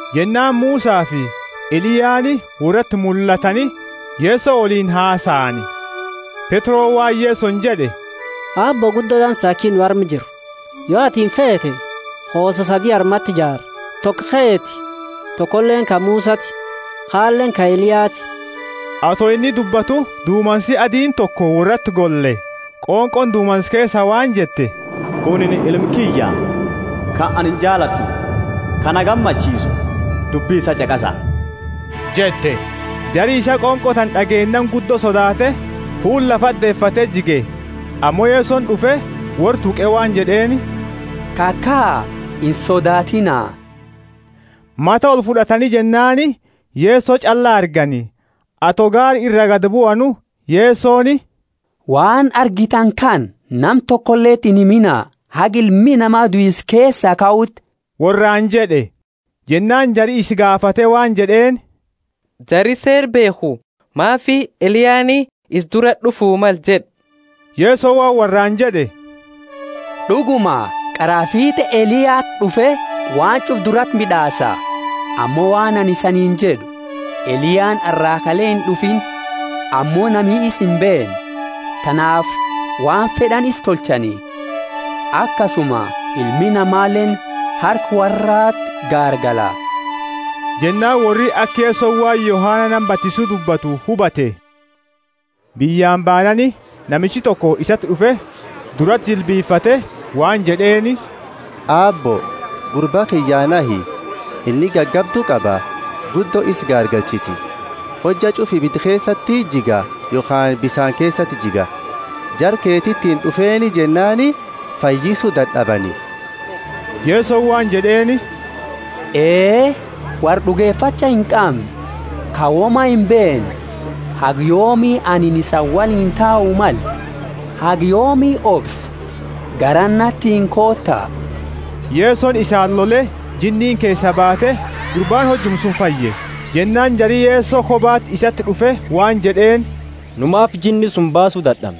Jennaani Musafi Eliyaani worrati mullatani Yeso woliini hasaani. Petroni waan Yesoni jed'e, Aabbo guddo dansa aki nu arma jiru. Yo atini feete, hoosa sadi armati jaara; toko keeti tokoleeni ka Musati kaleeni ka Eliyati. Ato inni dubbatu, dumansi adiini toko worrati golle, qonqooni dumansa keesa waan jette, Kunini Ilma kiyya ka anini jaalad'u, ka na gammachiisu, dubbi isaa ch'aqasa jette. Jari isaa qonqo tana d'ageennaani guddo sodaate fuula lafati deefate jige. Ammo Yesoni d'ufe, worra tuqe waan jed'eeni, Kakaa, insodaatiina! Mata olfud'atani jennaani Yeso ch'alla argani. Ato gaara ira gadi buanu, Yesoni, Waan argitani kana nama tokoleti inhimina haga Ilmi Nama duisa keesaa kauti worraani jed'e. Jennaani jari isa gaafate waan jed'eeni, Jari Seera beekhu maafi Eliyaani isa durati d'ufu male jed'a? Yesoni waan worraani jed'e, D'uguma, qaraa fiit'e Eliyati d'ufe waan ch'ufa durati mid'aasa. Ammo waan anini isaniini jed'u, Eliyaani arra kale ind'ufiini, ammo nami isa imbeenne; tanaafi waan fed'ani isa tolchani. Akasuma Ilmi Namaleeni harka worrati gaargala. Jennaani worri aka Yesoni waan Yohana nama batisu dubbatu hubate. Biyyaani baanaani, namichi toko isati d'ufe, durati jilbifate waan jed'eeni, Aabbo, gurba kiyyaa nahi, inni gagabdu qaba, guddo isa garagalchiti. Hojja ch'ufa ibida keesati jiga yokhaani bisaani keesati jiga. Jara keetiitini d'ufeeni jennaani fayyisu dad'abani. Yesoni waan jed'eeni, Ee, worra d'ugefacha inqamne, ka woma imbeenne, haga yoomi anini isani woliini tau male? Haga yoomi obsa? Garana natiini koota. Yesoni isaani lole, jinniini keesaa baate, gurbaani hojuma suni fayye. Jennaani jari Yeso kobati isati d'ufe waan jed'eeni, Nu maanifi jinni suni baasu dad'amne?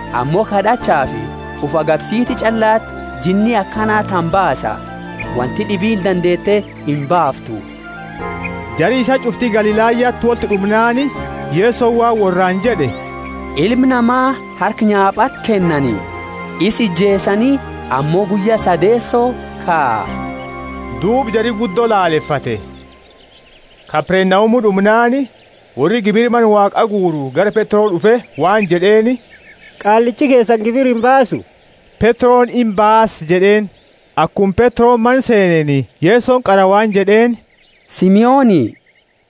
Ammo kad'achaafi ufi agabsiti ch'allati jinni akana tana baasa, wonti d'ibiini dandeete imbaaftu.] Jari isaa ch'ufti Galilayati wolti d'umnaani Yesoni waan worraani jed'e, Ilma Nama harka nyaapati, kennani, isa ijeesani, ammo guyya sadeeso kaa. Duuba jari guddo lalefate. Kapernaumu d'umnaani worri gibira Mana Waaqa guuru gara Petro d'ufe waan jed'eeni, Qaallichi keesani gibira imbaasu? Petroni, Imbaasa jed'eeni. Akuma Petroni mana seeneeni, Yesoni qara waan jed'eeni, Simoni,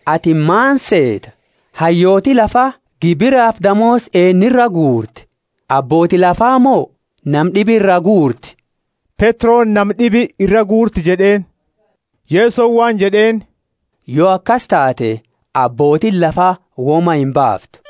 atini maani seeta? Hayyooti lafa gibirafi damoosa eennu iraa guurti? Abbooti lafa mo nama d'ibi iraa guurti? Petroni, Nama d'ibi iraa guurti jed'eeni. Yesoni waan jed'eeni, Yo akasi taate, abbootiini lafa woma imbaaftu.